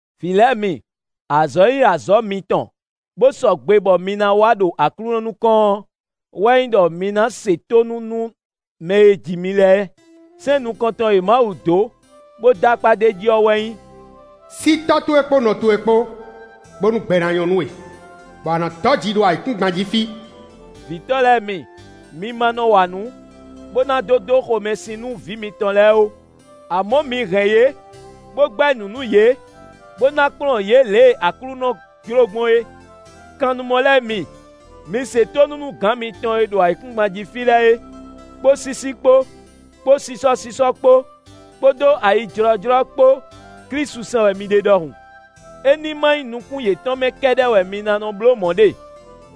Vǐ lɛ́ɛ mi, azɔ̌ e nyí azɔ̌ mitɔn bó sɔgbe bɔ mi ná wa ɖo Aklúnɔ nukɔn ɔ́ wɛ nyí ɖɔ mi ná se tónú nú mɛ e ji mi lɛ́ɛ. Sɛ́n nukɔntɔn e Mawu dó, bó dó akpá d'é jí ɔ́ wɛ nyí: “Sí tɔ́ towe kpódó nɔ towe kpó, bónú gbɛ ná nyɔ́ nú we, bɔ a nǎ dɔ́ ji ɖo ayǐkúngban jí fí.” Vǐtɔ́ lɛ́ɛ mi, mi ma nɔ wa nǔ, bó ná dó dó xomɛsin nú vǐ mitɔn lɛ́ɛ ó; amɔ̌ mi hɛn yě, bó gbɛ́ nǔ nú yě, bó ná kplɔ́n yě lě e Aklúnɔ jló gbɔn é. Kannumɔ lɛ́ɛ mi, mi se tónú nú gǎn mitɔn e ɖo ayǐkúngban jí fí lɛ́ɛ é, kpó sísí kpó, kpó sísɔ́sísɔ́ kpó, kpódó ayijlɔ́jlɔ́ kpó Klísu sɛn wɛ mi ɖe ɖɔhun. É ní ma nyí nukún yětɔn mɛ kɛ́ɖɛ́ wɛ mi ná bló mɔ̌ ɖe,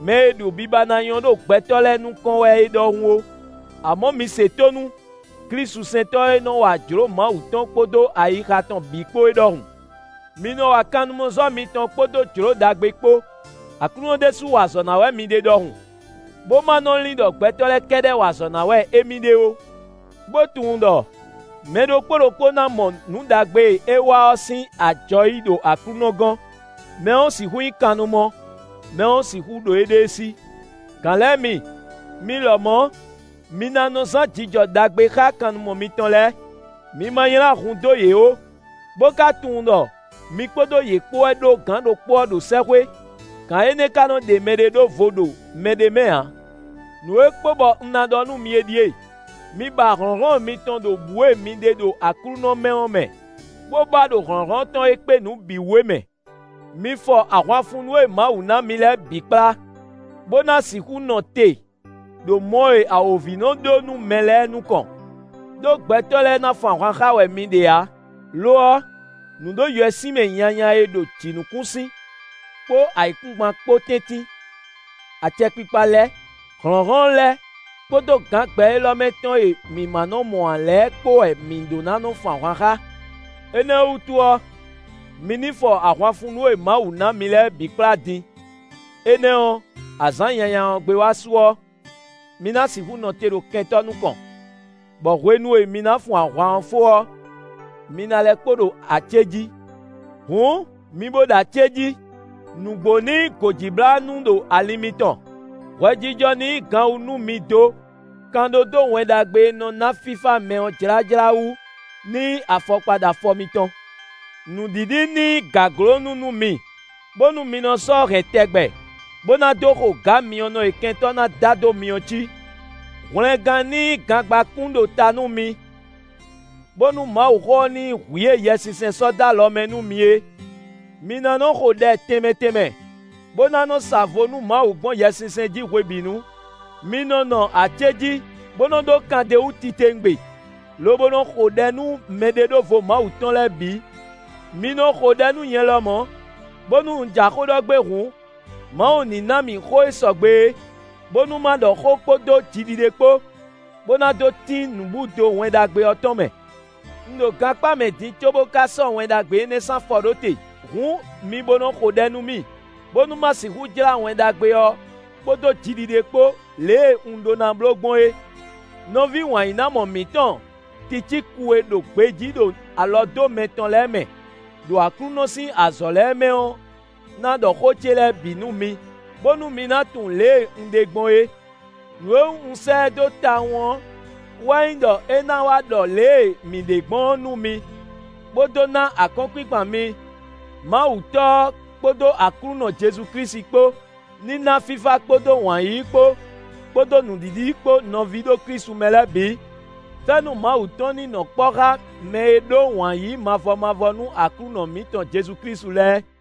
mɛ e ɖo biba ná nyɔ́ ɖo gbɛtɔ́ lɛ́ɛ nukɔn wɛ é ɖɔhun ó; amɔ̌ mi se tónú klísusɛntɔ́ e nɔ wa jlǒ Mawu tɔn kpódó ayixa tɔn bǐ kpó é ɖɔhun. Mi nɔ wa kannumɔzɔ́ mitɔn kpódó jlǒ ɖagbe kpó, Aklúnɔ ɖésú wa azɔ̌ ná wɛ mi ɖe ɖɔhun, bó ma nɔ lin ɖɔ gbɛtɔ́ lɛ́ɛ kɛ́ɖɛ́ wa azɔ̌ ná wɛ émí ɖe ó. Bó tunwun ɖɔ mɛ ɖokpó ɖokpó ná mɔ nǔ ɖagbe e é wa ɔ́ sín ajɔ yí ɖo Aklúnɔ gɔ́n; mɛ ɔ́ sixú nyí kannumɔ, mɛ ɔ́ sixú ɖo éɖée sí. Gǎn lɛ́ɛ mi, mi lɔmɔ̌, mi ná nɔ zán jijɔ ɖagbe xá kannumɔ mitɔn lɛ́ɛ. Mi ma nylá hun dó yě ó, bó ka tunwun ɖɔ mi kpódó yě kpó wɛ ɖó gǎn ɖokpó ɔ́ ɖo sɛ́xwé; gǎn énɛ́ ka nɔ ɖe mɛɖé ɖó vo ɖo mɛɖé mɛ ǎ. Nǔ e kpo bɔ un ná ɖɔ nú mi é ɖíe: mi ba hlɔ̌nhlɔ́n mitɔn ɖo bǔ e mi ɖe ɖo Aklúnɔ mɛ ɔ́ mɛ, bó ba ɖo hlɔ̌nhlɔ́n tɔn e kpé nǔ bǐ wú é mɛ. Mi fɔ ahwanfunnú e Mawu ná mi lɛ́ɛ bǐ kplá, bó ná sixú nɔ te ɖo mɔ e awǒvi nɔ ɖó nú mɛ lɛ́ɛ nukɔn. Đó gbɛtɔ́ lɛ́ɛ ná fun ahwan xá wɛ mi ɖe ǎ; lo ɔ́, nǔɖoyɛswímɛ nyanya e ɖo jǐnukúnsin kpó ayǐkúngban kpó tɛ́ntin, acɛkpikpa lɛ́ɛ, hlɔ̌nhlɔ́n lɛ́ɛ kpódó gǎn gbɛ élɔ́ mɛ tɔn e mǐ ma nɔ́ mɔ ǎ lɛ́ɛ kpó wɛ mi ɖó ná fun ahwan xá. Énɛ́ ɔ́ wútu ɔ́, mi ní fɔ ahwanfunnú e Mawu ná mi lɛ́ɛ bǐ kplá din; énɛ́ ɔ́, azǎn nyanya ɔ́ gbé wá su ɔ́, mi ná sixú nɔ te ɖo kɛntɔ́ nukɔn, bɔ hwenu e mi ná fun ahwan ɔ́ fó ɔ́, mi ná lɛ́ kpo ɖo acéjí. Hǔn mi bó ɖo acéjí. Nǔgbó ní nyí gǒjíblánú ɖo alin mitɔn; hwɛjijɔ ní nyí ganwu nú mi dó. Kan ɖó dó Wɛn Ɖagbe e nɔ ná fífá mɛ ɔ́ jlájlá wú ní nyí afɔkpa ɖo afɔ mitɔn. Nǔɖiɖi ní nyí gǎglónú nú mi, bónú mi nɔ sɔ́ hɛn tɛgbɛ, bó ná dó xo gǎ myɔnɔ e kɛntɔ́ ná da dó mi ɔ́ cí. Hwlɛngán ní nyí gangbákún ɖo ta nú mi, bónú Mawuxó ɔ́ ní nyí hwǐ e Yɛsinsɛn sɔ́ dó alɔ mɛ nú mi é. Mi ná nɔ xo ɖɛ tɛnmɛ tɛnmɛ, bó ná nɔ sa vo nú Mawu gbɔn Yɛsinsɛn jí hwebǐnu. Mi nɔ́ nɔ acéjí, bó nɔ́ ɖó kan d'é wú titewungbe, lobo nɔ xo ɖɛ nú mɛɖeɖóvo Mawu tɔn lɛ́ɛ bǐ. Mi nɔ xo ɖɛ nú nyɛ lɔmɔ̌, bónú un ja xó ɖɔ gbé hǔn, Mawu ní ná mì xó e sɔgbe é, bónú ma ɖɔ xó kpódó jiɖiɖe kpó, bó ná dó tín nǔbúdo Wɛn Ɖagbe ɔ́ tɔn mɛ. Un ɖo gankpá mɛ din cóbó ka sɔ́ Wɛn Ɖagbe énɛ́ sín afɔ ɖó te. Hǔn mi bo nɔ xo ɖɛ nú mì, bónú ma sixú jlá Wɛn Ɖagbe ɔ́ kpódó jiɖiɖe kpó lě e un ɖó ná bló gbɔn é. Nɔví wǎnyínámɔ mǐtɔn Ticíku e ɖo gbejí ɖo alɔdómɛ tɔn lɛ́ɛ mɛ, ɖo Aklúnɔ sín azɔ̌ lɛ́ɛ mɛ ɔ́ ná ɖɔ xó ce lɛ́ɛ bǐ nú mi, bónú mi ná tunwun lě e un ɖe gbɔn é. Nǔ e wú un sɛ́ ɛ dó tawun ɔ́ wɛ nyí ɖɔ é ná wá ɖɔ lě e mǐ ɖe gbɔn ɔ́ nú mi, bó dó ná akɔ́nkpinkpan mi. Mawu Tɔ́ ɔ́ kpódó Aklúnɔ Jezu Klísu kpó ní ná fífá kpódó wǎn yíyí kpó, kpódó nǔɖiɖi kpó nɔví ɖo Klísu mɛ lɛ́ɛ bǐ. Fɛ́nú Mawu tɔn ní nɔ kpɔ́ xá mɛ e ɖó wǎn yíyí mavɔ mavɔ nú Aklúnɔ mǐtɔn Jezu Klísu lɛ́ɛ.